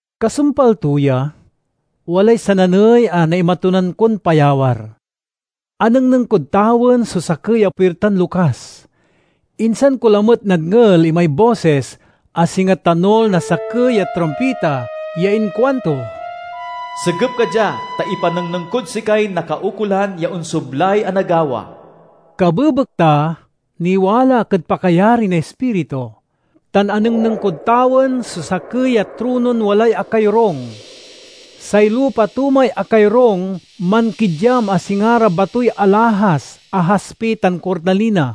Kasumpal to ya, walay sananey a naimatunan kon payawar: anengneng kod tawen so sakey a puirtan lokas. Insan ko lamet nadngel imay bosis a singa tanul na sakey a trumpita ya inkuanto, "Segep ka dia, ta ipanengneng kod sikay nakaukolan ya onsoblay a nagawa." Kabebekta, niwala ak ed pakayari na Ispiritu, tan anengneng kod tawen so sakey a tronon walay akayorung. Say lupa to may akayorung mankidyam a singa ra batoy alahas a haspi tan kornalina.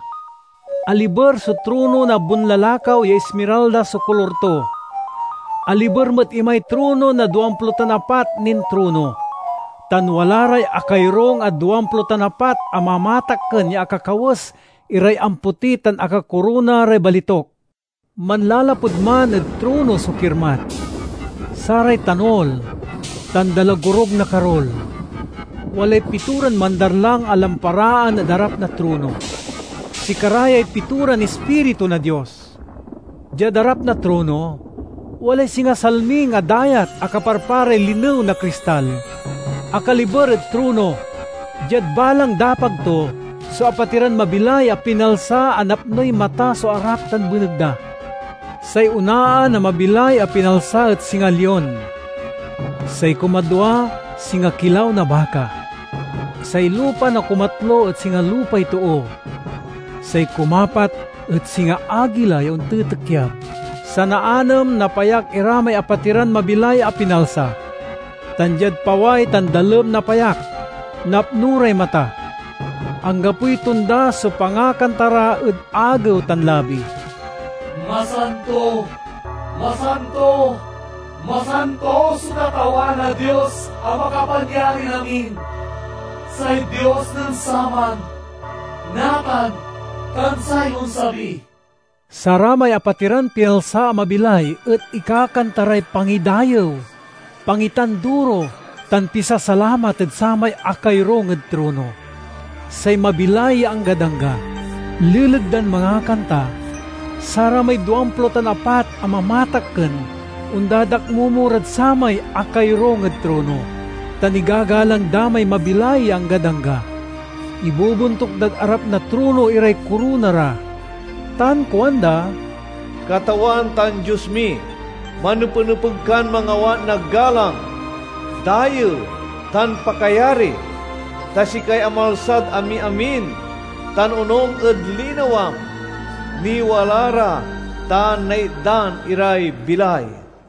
Aliber so trono na bonlalakaw ya ismiralda so kolor to. Aliber met imay trono na duamplo tan apat nin trono, tan wala ray akayorung a duamplo tan apat a mamatakken ya akakawes iray ampoti tan akakorona ray balituk. Manlalapud man ed trono so kirmat, saray tanul, tan dalagorug na karul. Walay pitoran mandarlang a lamparaan ed arap na trono; sikara yay pitoran ispiritu na Dios. Diad arap na trono, walay singa salming a dayat a kaparparay linew na kristal. Akaliber ed trono, diad balang dapag to, so apatiran mabilay a pinalsa a napnoy mata so arap tan beneg da. Say onaan a mabilay a pinalsa et singa lion; say kumadwa, singa kilaw na baka; say lupa na kumatlo et singa lupay too; say kumapat et singa agila ya ontitikyab. Sanaanem na payak ira may apatiran mabilay a pinalsa, tan diad paway tan dalem na payak, napno ray mata. Anggapoy tonda so pangakanta ra ed agew tan labi: "Masanto, masanto, masanto so Katawan a Dios a Makapanyarinamin, say Dios nen saman, natan, tan say onsabi." Saramay apatiran pinalsa a mabilay et ikakanta ray pangidayew, pangitanduro, tan pisasalamat ed samay akayorung ed trono, say mabilay ya anggad angga. Leleg dan mangakanta, saramay duamplo tan apat a mamatakken ondadakmomo rad samay akayorung ed trono, tan igagalang da may mabilay ya anggad angga. Ibobontuk dad arap na trono iray korona ra, tan kuanda: "Katawan tan Dios mi! Manepenepeg kan mangawat na galang, dayew, tan pakayari. Ta sikay amalsad amiamin, tan onung ed linawam, niwala ra tan naitdan iray bilay."